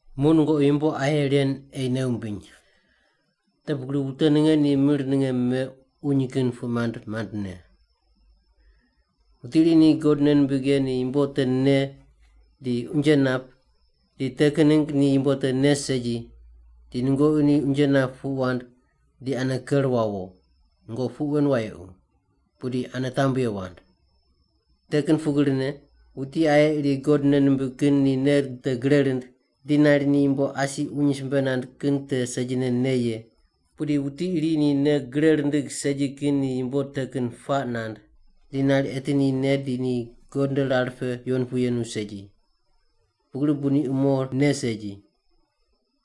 Muq nungoqi yumbo aye ren ei nei wumbiny. Te pugri wute ninge ni mir ninge me uny kin puq mand mandne. Wuti iri ni God nei nimbig ye ni yumbo te ne di unje nap, di te kin ningg ni yumbo te ne segi, di nungoqi ni unje nap puq wand di ane ker wawo. Nungoqi puq wen wayequ, pudi ane tambye wand. Te kin pugrine, wuti aye iri God nei nimbig kin ni nei te gre rind di nari ni yumbo asi uny simbe mand kin te segine ne ye, pudi wuti iri ni nei gre rindig segi kin ni yumbo te kin puaq nand, di nari eti ni ne di ni God nde rar pe yuwon pu yenu segi. Pugri bu ni umo ne segi.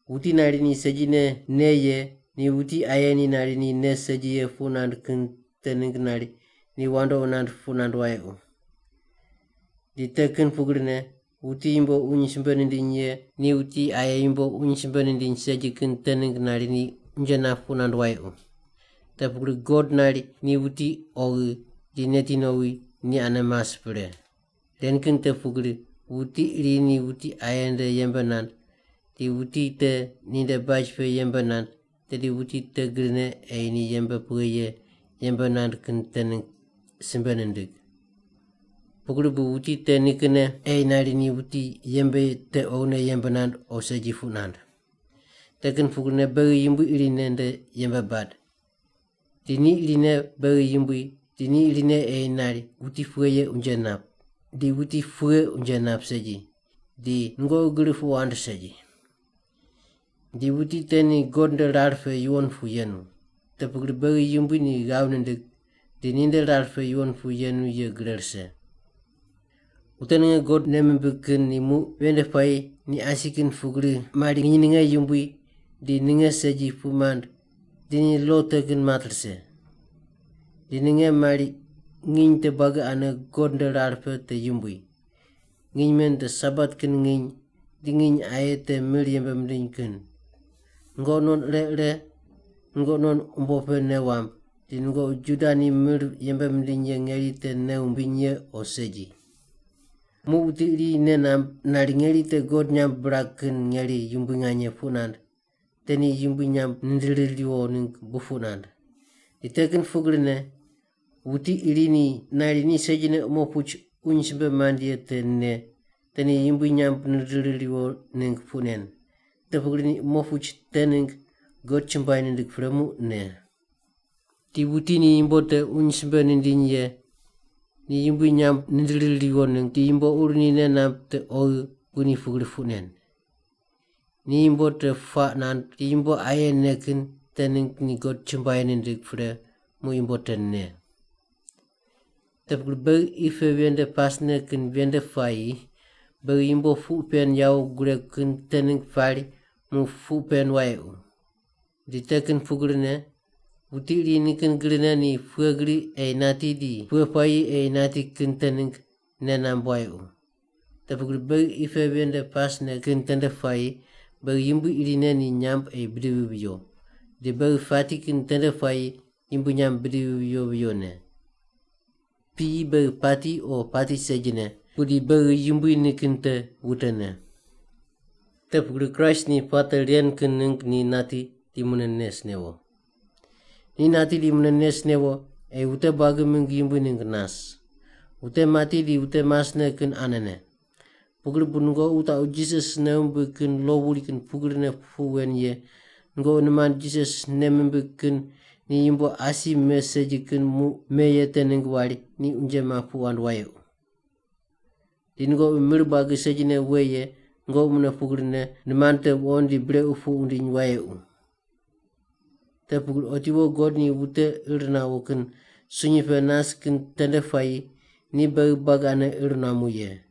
Wuti nari ni segine ne ye ni wuti aye ni nari ni ne segi ye puq nand kin te ningg nari ni wandoqi nand puq nand wayequ. Di te kin pugrine, wuti yumbo uny simbe nindiny ye ni wuti aye yumbo uny simbe nindiny segi kin te ningg nari ni unje nap puq nand wayequ. Te pugri God nari ni wuti oghi di neti nowi ni ane mas pre. Ren kin te pugri, wuti iri ni wuti aye nde yembe nand, di wuti te ninde baj pe yembe nand, tedi wuti te grine ei ni yembe pughe ye yembe nand kin te ningg simbe nindig. Pugri bu wuti te nikinne ei nari ni wuti yembe ye te oghine yembe nand o segi puq nand. Te kin pugrine beghi Yumbui irine nde yembe bad, di ni irine beghi Yumbui di ni irine ei nari wuti pughe ye unje nap, di wuti pughe unje nap segi, di nungoqi gri puq wand segi. Di wuti te ni God nde rar pe yuwon pu yenu. Te pugri beghi Yumbui ni ghav nindig di ninde rar pe yuwon pu yenu ye gre rise. Wute ninge God nei mimbig kin ni muq ven nde puayi ni asi kin pugri mari nginy ninge yumbui di ninge segi puq mand di ni lo te kin mat rise. Di ninge mari nginy te buagi ane God nde rar pe te yumbui. Nginy men te Sabat kin nginy di nginy aye te mir yembe mindiny kin. Nungoqi non ire ire nungoqi non umbo pe nei wamb, di nungoqi Juda ni mir yembe mindiny ye ngeri te nei wumbiny ye o segi. Muq wuti iri nei namb nari ngeri te God nyamb birag kin ngeri yumbui nganye puq nand, te ni Yumbui nyamb nindiri riwo ningg bu puq nand. Di te kin pugrine, wuti iri ni nari ni segine umo puch uny simbe mand ye te ne, te ni Yumbui nyamb nindiri riwo ningg puq nen. Te pugri ni umo puch te ningg God chumbuai nindig pre muq ne. Di wuti ni yumbo te uny simbe nindiny ye ni Yumbui nyamb nindiri riwo ningg di yumbo ur ni nei namb te oghi bu ni pugri puq nen. Ni yumbo te puaq nand di yumbo aye ne kin te ningg ni God chumbuai nindig pre muq yumbo te ne. Te pugri beghi qi pe ven nde pasne kin ven nde puayi beghi yumbo puq pen yawo guregu kin te ningg pari muq puq pen wayequ. Di te kin pugrine wuti iri nikin grine ni pughe gri ei nati di pughe puayi ei nati kin te ningg nei namb wayequ. Te pugri beghi qi pe ven nde pasne kin tende puayi beghi Yumbui irine ni nyamb ei bidivi viyo. Di beghi pati kin tende puayi Yumbui nyamb bidivi viyo viyone. Piyi beghi pati o pati segine, pudi beghi Yumbui nikin te wutene. Te pugri Kraist ni puate ren kin ningg ni nati di mune nes newo. Ni nati di mune nes newo ei wute buagi mingg Yumbui ningg nas. Wute mati di wute masne kin anene. Pugri bu nungoqi wutaqu Jisas nei wumbig kin lo wuri kin pugrine puq wen ye nungoqi nimand Jisas nei mimbig kin ni yumbo asi me segi kin muq me ye te ningg wari ni unje map puq wand wayequ. Di nungoqi mir buagi segine we ye nungoqi mune pugrine nimand te wuqond di brequ puq wundiny wayequ. Te pugri otiwo God ni wute ir nawo kin sunyi pe nas kin tende puayi ni beghi buagi ane ir nuamu ye.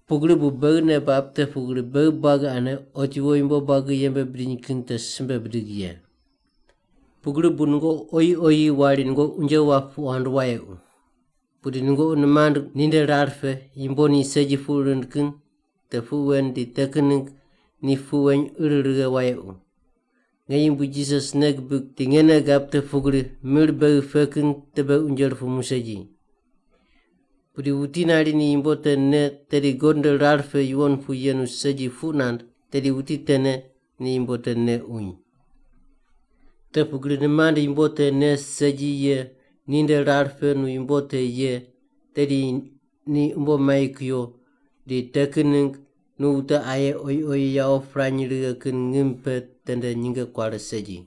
Pugri bu beghi nei bab te pugri beghi buagi ane otiwo yumbo buagi yembe bidiny kin te simbe bidig ye. Pugri bu nungoqi oyi oyi wari nungoqi unje wap puq wand wayequ. Pudi nungoqi nimand ninde rar pe yumbo ni segi puq rind kin te puq wen di te kin ningg ni puq weny ir righe wayequ. Nge Yumbui Jisas nei gibig di nge nei gab te pugri mir beghi pe kin te beghi unje rupumu segi. Pudi wuti nari ni yumbo te ne tedi God nde rar pe yuwon pu yenu segi puq nand, tedi wuti tene ni yumbo te ne uny. Te pugri nimand yumbo te ne segi ye ninde rar pe nu yumbo te ye, tedi ni umbo mai kuyo di te kin ningg nu wute aye oyi oyi yawo pirany righe kin ngim pe tende nyinge kuare segi.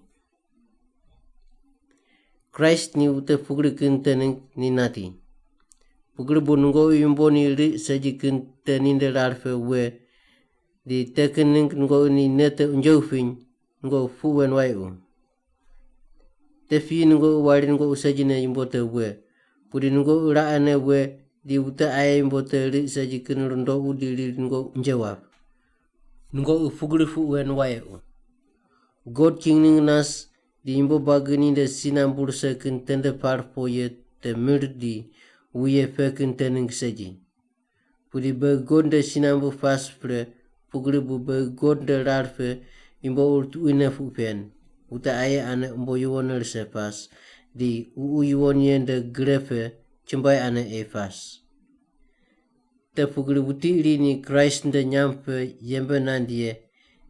Kraist ni wute pugri kin te ningg ni nati. Pugri bu nungoqi yumbo ni riq segi kin te ninde rar pe we di te kin ningg nungoqi ni nei te unje wupiny, nungoqi puq wen wayequ. Te piyi nungoqi wari nungoqi segine yumbo te we, pudi nungoqi raqene we di wute aye yumbo te riq segi kin rundoqu di riri nungoqi unje wap. Nungoqi pugri puq wen wayequ. God king ningg nas di yumbo buagi ninde si nambu rise kin tende par po ye te mir di wuye pe kin te ningg segi. Pudi beghi God nde si nambu pas pre pugri bu beghi God nde rar pe yumbo ur tuquine puq pen, wute aye ane umbo yuwonne rise pas, di Ququ Yuwon Ye nde gre pe chumbuai ane ei pas. Te pugri wuti iri ni Kraist nde nyamb pe yembe nand ye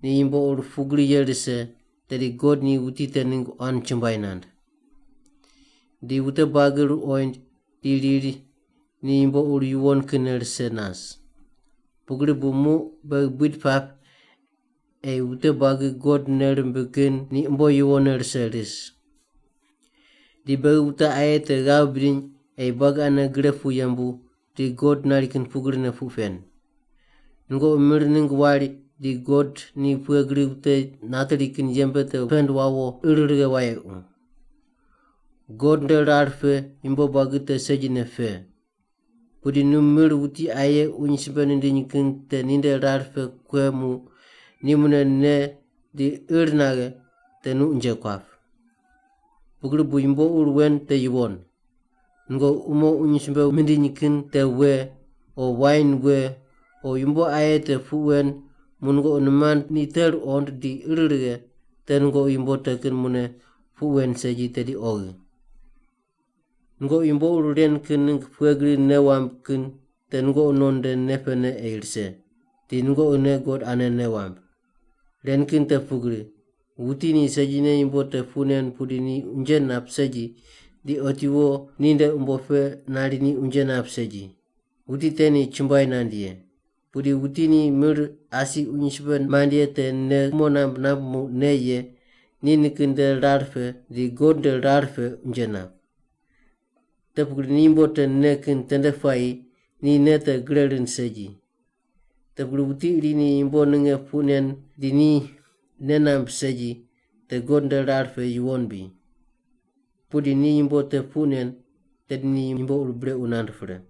ni yumbo ur pugri ye rise, tedi God ni wuti te ningg quan chumbuai nand. Di wute buagi ruqoind di riri ni yumbo ur yuwon kinne rise nas. Pugri bu muq beghi buid pap ei wute buagi God nei rimbig kin ni umbo yuwonne rise ris. Di beghi wute aye te ghav bidiny ei buagi ane gre pu yembu di God nari kin pugrine puq pen. Nungoqi mir ningg wari di God ni pughe gri wute nateri kin yembe te pend wawo ir righe wayequ. God nde rar pe yumbo buagi te segine pe. Pudi nu mir wuti aye uny simbe nindiny kin te ninde rar pe kue muq ni mune ne di ir naghe te nu unje kuap. Pugri bu yumbo ur wen te yuwon. Nungoqi umo uny simbe mindiny kin te we, o wain we, o yumbo aye te puq wen muq nungoqi nimand ni te ruqond di ir righe, te nungoqi yumbo te kin mune puq wen segi tedi oghi. Nungoqi yumbo ur ren kin ningg pughe gri nei wamb kin te nungoqi non nde nei pene ei rise, di nungoqine God ane nei wamb. Ren kin te pugri, wuti ni segine yumbo te puq nen pudi ni unje nap segi di otiwo ni nde umbo pe nari ni unje nap segi. Wuti te ni chumbuai nand ye. Pudi wuti ni mir asi uny simbe mand ye te nei kumo namb namb muq ne ye, ni nikin nde rar pe di God nde rar pe unje nap. Te pugri ni yumbo te ne kin tende puayi ni nei te gre rind segi. Te pugri wuti iri ni yumbo ninge puq nen di ni nei namb segi, “te God nde rar pe yuwon bri.” Pudi ni yumbo te puq nen, tedi ni yumbo ur brequ nand pre.